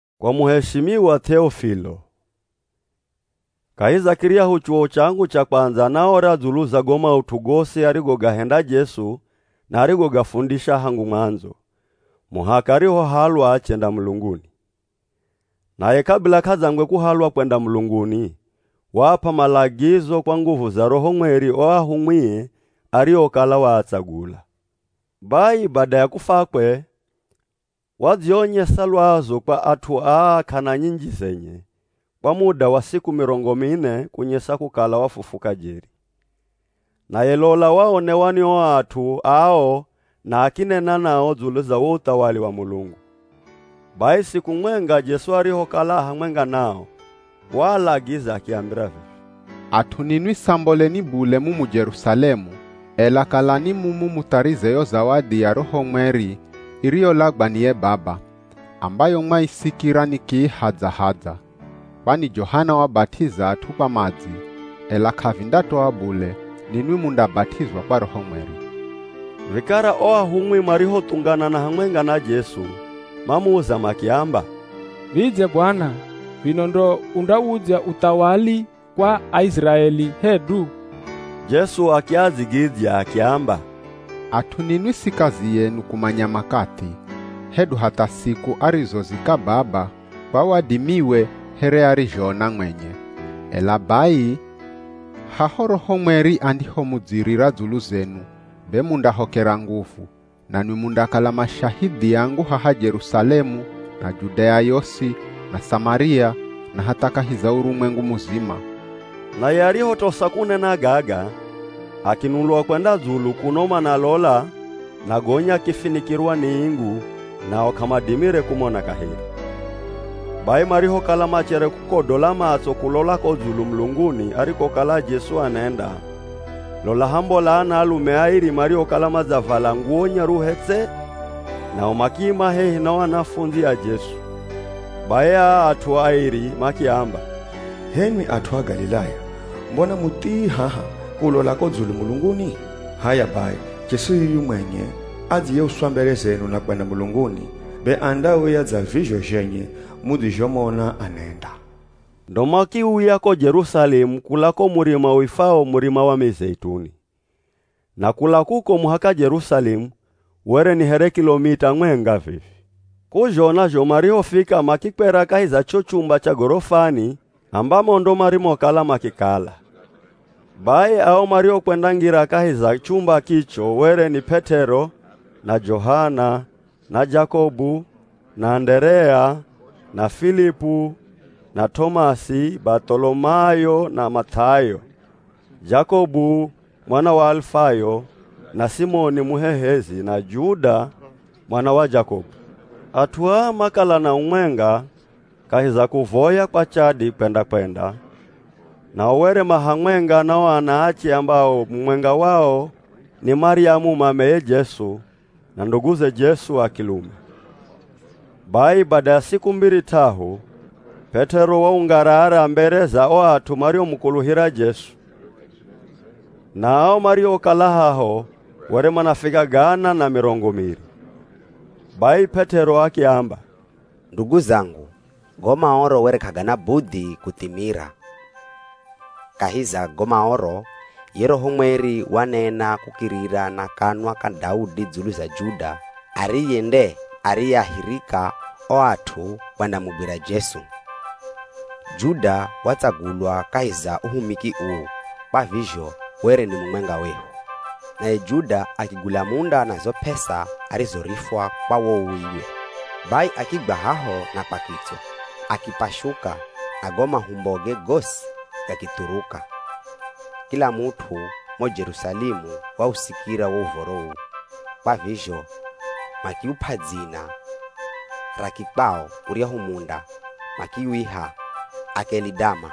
Kwa muheshimiwa Th'eofilo. Kahi za kiryahu chuwo changu cha kwandza naora dzulu za go maut'u gosi arigogahenda Jesu na arigogafundisha hangu mwandzo, muhaka arihohalwa achenda mulunguni. Naye kabila k'adzangwe kuhalwa kwenda mulunguni, waap'a malagizo kwa nguvu za Roho Mweri o ahumwie ariokala waatsagula. Bai bada ya kufwakwe, wadzionyesa lwazu kwa at'u aa k'ana nyinji zenye, kwa muda wa siku mirongo mine kunyesa kukala wafufuka jeri. Naye lola waonewa ni o at'u ao na akinena nao dzulu za wo uthawali wa Mulungu. Bai siku mwenga Jesu arihokala a hamwenga nao, waalagiza akiambira vivi, “At'u ninwi samboleni bule mumu Jerusalemu, ela kalani mumu mutharize yo zawadi ya Roho Mweri iriyolagwa ni ye Baba, ambayo mwaisikira nikiihadza-hadza. Kwani Johana wabat'iza at'u kwa madzi, ela k'avindatoa bule ninwi mundabat'izwa kwa Roho Mweri.” Vikara o ahumwi marihothunganana hamwenga na Jesu, mamuza makiamba, “Vidze Bwana, vino ndo undawudzya uthawali kwa Aiziraeli hedu?” Jesu akiadzigidzya akiamba, “At'u ninwi si kazi yenu kumanya makathi, hedu hatha siku arizozika Baba kwa wadimiwe here arizhoona mwenye. Ela bai haho Roho Mweri andihomudzirira dzulu zenu, be mundahokera nguvu, nanwi mundakala mashahidhi angu haha Jerusalemu, na Judea yosi na Samaria na hatha kahi za urumwengu muzima.” Naye arihotosa kunena gaga, akinulwa kwenda dzulu kuno manalola na gonya akifinikirwa ni ingu nao k'amadimire kumona kaheri. Bai marihokala machere kukodola matso kulola ko dzulu mulunguni arikokala Jesu anenda, lola hambola anaalume airi mariokala madzavala nguwo nyaruhe tse, nao makiima hehi na o anafundzi a Jesu. Bai aa at'u airi makiamba, “H'enwi at'u a Galilaya, mbona muthii haha kulola ko dzulu mulunguni? H'aya bai Jesu yuyu mwenye adziyeuswa mbere zenu na kwenda mulunguni, be andauya dza vizho zhenye mudzizhomona anenda.” Ndo makiuya ko Jerusalemu kula ko murima uifwao Murima wa Mizeituni. Na kula kuko muhaka Jerusalemu were ni here kilomita mwenga vivi. K'uzhona zho, marihofika makikwera kahi za cho chumba cha gorofani ambamo ndo marimokala makikala. Bai ao mariokwendangira kahi za chumba kicho were ni, P'et'ero, na Johana, na Jakobu, na Anderea, na Filipu na T'omasi, Bath'olomayo na Math'ayo, Jakobu mwana wa Alifayo na Simoni Muhehezi, na Juda mwana wa Jakobu. At'u aa makala na umwenga, kahi za kuvoya kwa chadi kwenda-kwenda, nao were ma hamwenga na o anaache ambao mumwenga wao ni Maryamu mameye Jesu, na nduguze Jesu a kilume. Bai bada ya siku mbiri t'ahu, P'et'ero waungarara mbere za o at'u mariomukuluhira Jesu. Na ao mariokala haho were manafika gana na mirongo miri. Bai P'et'ero akiamba, “Ndugu zangu, go Maoro were k'agana budhi kuthimira. Kahi za go Maoro, ye Roho Mweri wanena kukirira na kanwa ka Daudi dzulu za Juda ariye nde ariyeahirika o at'u kwendamugwira Jesu. Juda watsagulwa kahi za uhumiki uu, kwa vizho were ni mumwenga wehu.” (Naye Juda akigula munda na zo p'esa arizorifwa kwa wo uwiwe. Bai akigwa haho na kwa kitswa, akipashuka na go mahumboge gosi gakithuruka. Kila mut'u mo Jerusalemu wausikira wo uv̱oro uu, kwa vizho makiup'a dzina ra kikwao uryahu munda makiwiha “Akelidama”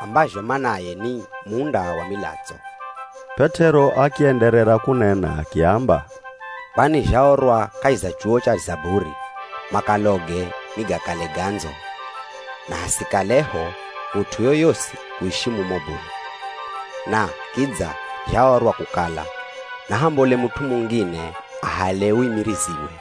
ambazho manaye ni “Munda wa milatso.”) P'et'ero akienderera kunena akiamba, “Kwani zhaorwa kahi za chuwo cha Zaburi, ‘Makaloge nigakale gandzo; na hasikaleho mut'u yoyosi kuishi mumo bule.’” “Na kidza zhaorwa kukala, ‘Nahambole mut'u mungine ahale uimiriziwe.’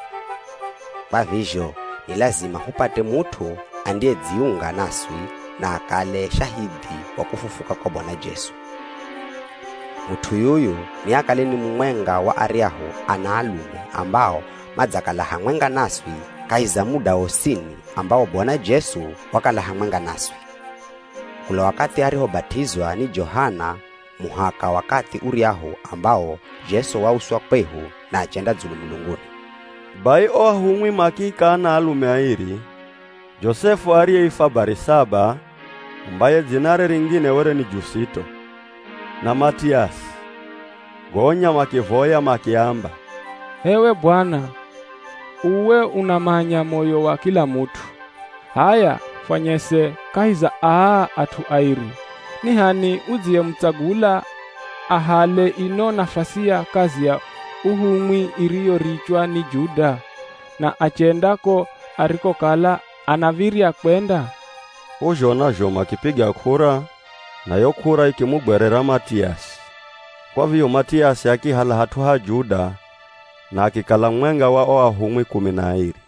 “Kwa vizho ni lazima hupate mut'u andiyedziunga naswi na akale shahidhi wa kufufuka kwa Bwana Jesu. Mut'u yuyu niakale ni mumwenga wa aryahu anaalume ambao madzakala hamwenga naswi kahi za muda wosini ambawo Bwana Jesu wakala hamwenga naswi. Kula wakathi arihobat'izwa ni Johana muhaka wakathi uryahu ambawo Jesu wauswa kwehu na achenda dzulu mulunguni.” Bai o ahumwi makiika anaalume airi, Josefu ariyeifwa Barisaba (ambaye dzinare ringine were ni Jusito) na Matiasi. Gonya makivoya makiamba, “H'ewe Bwana, uwe unamanya moyo wa kila mut'u. H'aya fwanyese kahi za aa at'u airi, ni h'ani udziyemutsagula ahale ino nafasi ya kazi ya uhumwi iriyorichwa ni Juda, na achenda ko arikokala anav̱irya kwenda.” K'uzhona zho makipiga k'ura, na yo k'ura ikimugwerera Matiasi. Kwa vizho Matiasi akihala hat'u ha Juda na akikala mumwenga wa o ahumwi kumi na airi.